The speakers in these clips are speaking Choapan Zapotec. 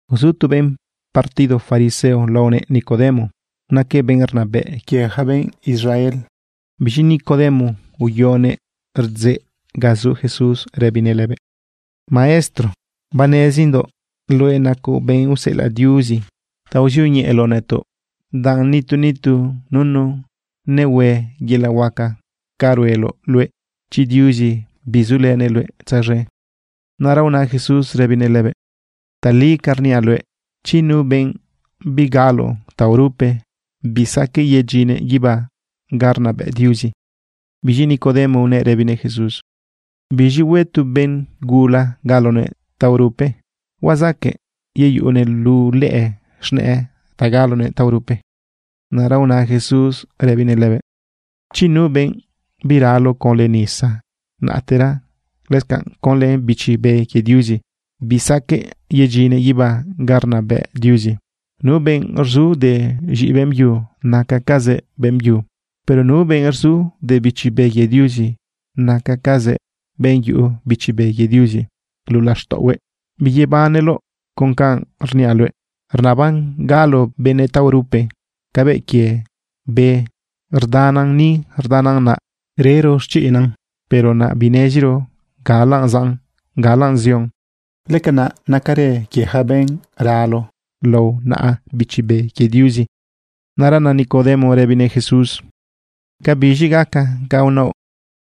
Uzu tu benꞌ partido fariseo laonëꞌ Nicodemo. Naquëꞌ benꞌ rnabëꞌ quie yaca benꞌ Israel. Biz̃i Nicodemo uyonëꞌ rdzeꞌ ga zu Jesús rëbinëꞌ lëbëꞌ: ―Maestro, banezindoꞌ luëꞌ nacoꞌ benꞌ useꞌelaꞌ Diuzi ta uzioñeꞌeloꞌ nëtoꞌ, danꞌ nitu nitu nunu nehue yelaꞌ huaca ca rueloꞌ luëꞌ chi Diuzi bizulënëꞌ luëꞌ tzaz̃e. Naꞌra una Jesús rëbinëꞌ lëbëꞌ: ―Tali ca rniaꞌ luëꞌ, chi nu benꞌ bigalo taorupe, bisaqueꞌ yedyinnëꞌ guibá ga rnabëꞌ Diuzi. Biz̃i Nicodemo unëꞌ rëbinëꞌ Jesús: ―¿Biz̃i hue tu benꞌ gula galonëꞌ taorupe? ¿Huazaqueꞌ yeyuꞌunëꞌ luꞌu lëꞌë z̃nëꞌë ta galonëꞌ taorupe? Naꞌra una Jesús rëbinëꞌ lëbëꞌ: ―Chi nu benꞌ biralo conlë nisa, naꞌtera lëscanꞌ conlë Bichi Be quie Diuzi, bisaqueꞌ yedyinnëꞌ guibá ga rnabëꞌ Diuzi. Nu benꞌ rzu de z̃iꞌi beꞌmbyu, nacacazëꞌ beꞌmbyu. Pero nu benꞌ rzu de Bichi Be quie Diuzi, nacacazëꞌ benꞌ yuꞌu Bichi Be quie Diuzi luꞌu laxtaꞌohue. Biyebaneloꞌ con canꞌ rniaꞌ luëꞌ: “Rnaban galo benëꞌ taorupe.” Cabëꞌ quie be, rdanan ni, rdanan naꞌ, rero xchiꞌnan, pero naꞌ bineziro galaꞌ zaꞌn, galaꞌ zion. Lëcanaꞌ nacarë quie yaca benꞌ ralo lao naꞌa Bichi Be quie Diuzi. Naꞌra na Nicodemo rëbinëꞌ Jesús: ―¿Cabiz̃i gaca ca unaoꞌ?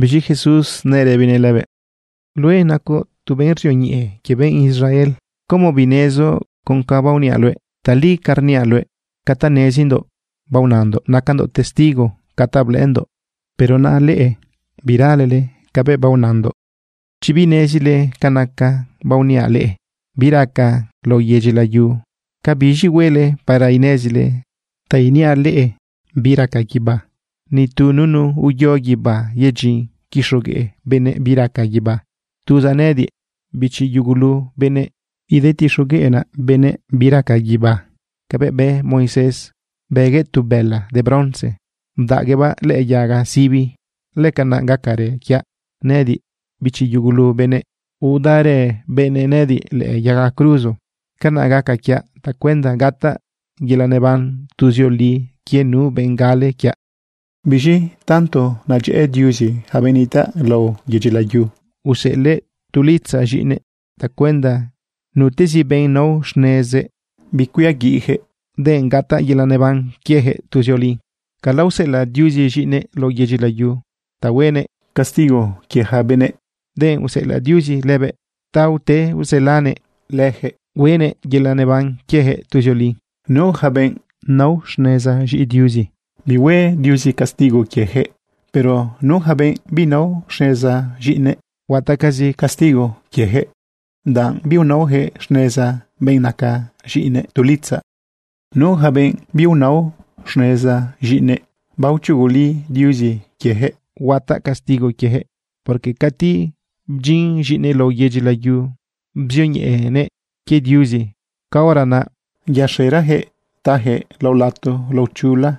Biz̃i Jesús nëꞌ rëbinëꞌ lëbëꞌ: ―Nacoꞌ tu maestro quie benꞌ Israel, ¿cómo binezoꞌ con ca baoniaꞌ luëꞌ? Tali ca rniaꞌ luëꞌ, ca ta nezindoꞌ baonandoꞌ nacandoꞌ testigo ca ta blëꞌëndoꞌ, pero naꞌ leꞌe biralele cabëꞌ baonandoꞌ. Chi binezile ca naca baoniaꞌ leꞌe bi raca lao yedyi layu, ¿cabiz̃i huele para inezile ta iniaꞌ leꞌe bi raca guibá? ’Nitu nunu uyo guibá yedyin quixogueꞌ benëꞌ bi raca guibá. Tuzaꞌ nëꞌëdiꞌ, bichi yugulu benëꞌ, idetixogueꞌnaꞌ benëꞌ bi raca guibá. Cabëꞌ bë Moisés bëguëꞌ tu bëla de bronce, bdaꞌguëꞌbaꞌ lëꞌë yaga sibi, lëcanaꞌ gacarë quiaꞌ nëꞌëdiꞌ, bichi yugulu benëꞌ, udaꞌrë benëꞌ nëꞌëdiꞌ lëꞌë yaga cruzo. Canaꞌ gaca quiaꞌ tacuenda gataꞌ yelaꞌ neban tuzioli quie nu benꞌ gale quiaꞌ. ’Biz̃i tanto nedyëꞌë Diuzi yaca benëꞌ nitaꞌ lao yedyi layu, useꞌelëꞌ tu litzaꞌ z̃iꞌinëꞌ tacuenda nutezi benꞌ nao xnezëꞌ, bicuiaguiꞌyaquëꞌ, denꞌ gataꞌ yelaꞌ neban quiejëꞌ tuzioli. Cala useꞌelaꞌ Diuzi z̃iꞌinëꞌ lao yedyi layu ta huenëꞌ castigo quie yaca benëꞌ, denꞌ useꞌelaꞌ Diuzi lëbëꞌ ta ute uselanëꞌ leyaquëꞌ hueꞌnëꞌ yelaꞌ neban quiejëꞌ tuzioli. ’Nu yaca benꞌ nao xneza z̃iꞌi Diuzi, bihue Diuzi castigo quieyaquëꞌ. Pero nu yaca benꞌ binao xneza z̃iꞌinëꞌ, huataꞌcazi castigo quieyaquëꞌ, danꞌ biunaoyaquëꞌ xneza benꞌ naca tu litzaꞌ z̃iꞌinëꞌ. Nu yaca benꞌ biunao xneza z̃iꞌinëꞌ, baochuguli Diuzi quieyaquëꞌ huataꞌ castigo quiejëꞌ, porque cati bdyin z̃iꞌinëꞌ lao yedyi layu bzioñeꞌenëꞌ quie Diuzi, caora naꞌ yaxerayaquëꞌ tayaquëꞌ lao lato lao chula,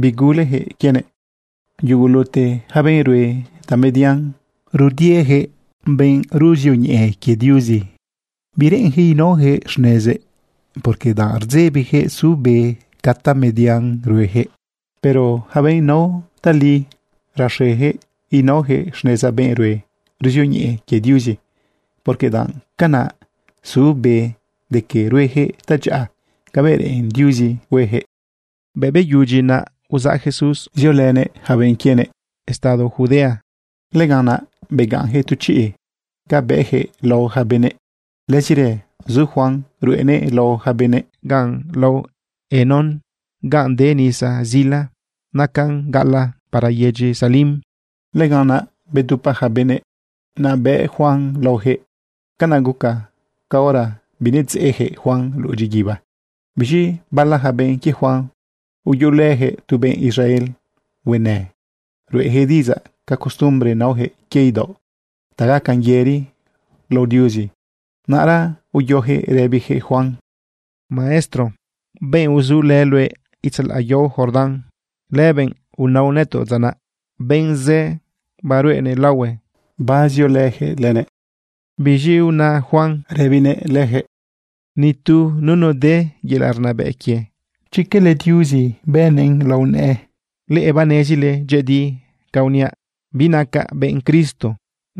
biguleyaquëꞌ quienëꞌ. Yugulute yaca benꞌ rue tamedian rudieyaquëꞌ benꞌ ruzioñeꞌe quie Diuzi. Bireꞌenyaquëꞌ naoyaquëꞌ xnezëꞌ, porque danꞌ rdzebiyaquëꞌ su be ca tamedian rueyaquëꞌ. Pero yaca benꞌ nao tali, raxeyaquëꞌ naoyaquëꞌ xneza benꞌ ruzioñeꞌe quie Diuzi, porque danꞌ canaꞌ su be de que rueyaquëꞌ tadyaꞌa cabëꞌ reꞌen Diuzi hueyaquëꞌ. Bëꞌ beyudyi naꞌ, uzaꞌ Jesús ziolënëꞌ yaca benꞌ quienëꞌ estado Judea. Lëganꞌ naꞌ begaꞌnyaquëꞌ tu chiꞌ ga bëꞌyaquëꞌ lao yaca benëꞌ. Lëzirë zu Juan ruꞌenëꞌ lao yaca benëꞌ ganꞌ lao Enón, ganꞌ de nisa zila. Nacan gaꞌalaꞌ para yedyi Salim. Lëganꞌ naꞌ bedupa yaca benëꞌ, naꞌ bëꞌ Juan laoyaquëꞌ. Canaꞌ guca caora binedzeꞌyaquëꞌ Juan luꞌu dyiguiba. Biz̃i bala yaca benꞌ quie Juan uyuꞌulëyaquëꞌ tu benꞌ Israel huenë ruꞌeyaquëꞌ diꞌidzaꞌ ca costumbre naoyaquëꞌ quie idaoꞌ ta gacan yëri lao Diuzi. Naꞌra uyoyaquëꞌ rëbiyaquëꞌ Juan: ―Maestro, benꞌ uzulë luëꞌ itzalaꞌ yao Jordán, lëbenꞌ unaoꞌ nëtoꞌ dza naꞌ, benꞌ zë baruꞌenëꞌ laohue, bazioyaquëꞌ lënëꞌ. Biz̃i una Juan rëbinëꞌ leyaquëꞌ: ―Ni tu nunu de yelaꞌ rnabëꞌ quie, chi cala Diuzi bëꞌnëꞌn lao nëꞌë. Leꞌe banezile dyëꞌëdi ca uniaꞌ. Binacaꞌ benꞌ Cristo.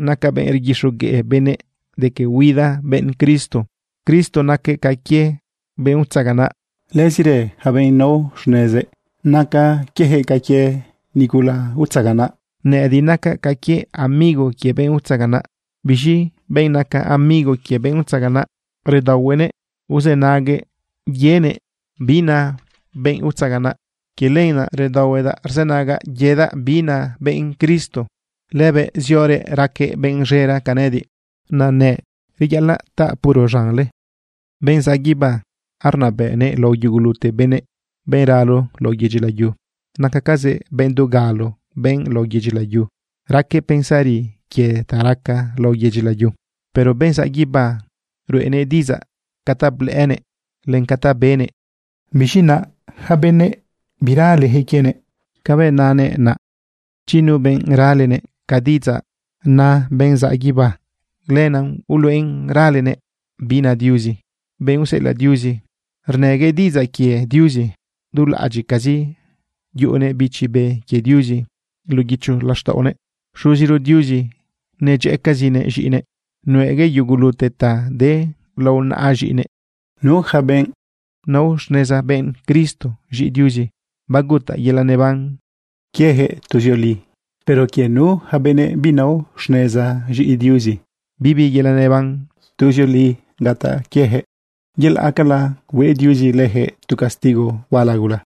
Nacaꞌ benꞌ rguixogueꞌ benëꞌ de que huida benꞌ Cristo. Cristo naquëꞌ ca quie benꞌ utzaganaꞌ. Lëzirë yaca benꞌ nao xnezëꞌ, naca quieyaquëꞌ ca quie nigula utzaganaꞌ. Nëꞌëdiꞌ nacaꞌ ca quie amigo quie benꞌ utzaganaꞌ. Biz̃i benꞌ naca amigo quie benꞌ utzaganaꞌ, redaohuenëꞌ uzënaguëꞌ yenëꞌ bi na benꞌ utzaganaꞌ. Quie lenaꞌ redaohuedaꞌ rzënagaꞌ yedaꞌ bi na benꞌ Cristo. Lëbëꞌ ziorëꞌ raquëꞌ benꞌ z̃era ca nëꞌëdiꞌ, reyaꞌalaꞌ taꞌ puro z̃anle. Benꞌ zaꞌ guibá, arnabëꞌnëꞌ lao yugulute benëꞌ. Benꞌ ralo lao yedyi layu, nacacazëꞌ benꞌ dugalo de lao yedyi layu. Raquëꞌ pensari quie ta raca lao yedyi layu. Pero benꞌ zaꞌ guibá, ruꞌenëꞌ diꞌidzaꞌ ca ta blëꞌënëꞌ len ca ta benëꞌ. Biz̃i naꞌ yaca benëꞌ biraleyaquëꞌ quienëꞌ cabëꞌ nanëꞌ naꞌ. Chi nu benꞌ ralenëꞌ ca diꞌidzaꞌ na benꞌ zaꞌ guibá, lenaꞌ uluꞌen ralenëꞌ bi na Diuzi. Benꞌ useꞌelaꞌ Diuzi, rnëguëꞌ diꞌidzaꞌ quie Diuzi. Dulaꞌadyiꞌcazi yuꞌunëꞌ Bichi Be quie Diuzi luꞌu guicho laxtaꞌonëꞌ. Xuziro Diuzi nedyëꞌëcazinëꞌ z̃iꞌinëꞌ. Nuꞌeguëꞌ yugulute ta de lao naꞌa z̃iꞌinëꞌ. Nu yaca benꞌ nao xneza benꞌ Cristo z̃iꞌi Diuzi, bagutaꞌ yelaꞌ neban quieyaquëꞌ tuzioli. Pero quie nu yaca benëꞌ binao xneza z̃iꞌi Diuzi, bibi yelaꞌ neban tuzioli gataꞌ quieyaquëꞌ, yelaꞌcala hue Diuzi lëyaquëꞌ tu castigo huala gula.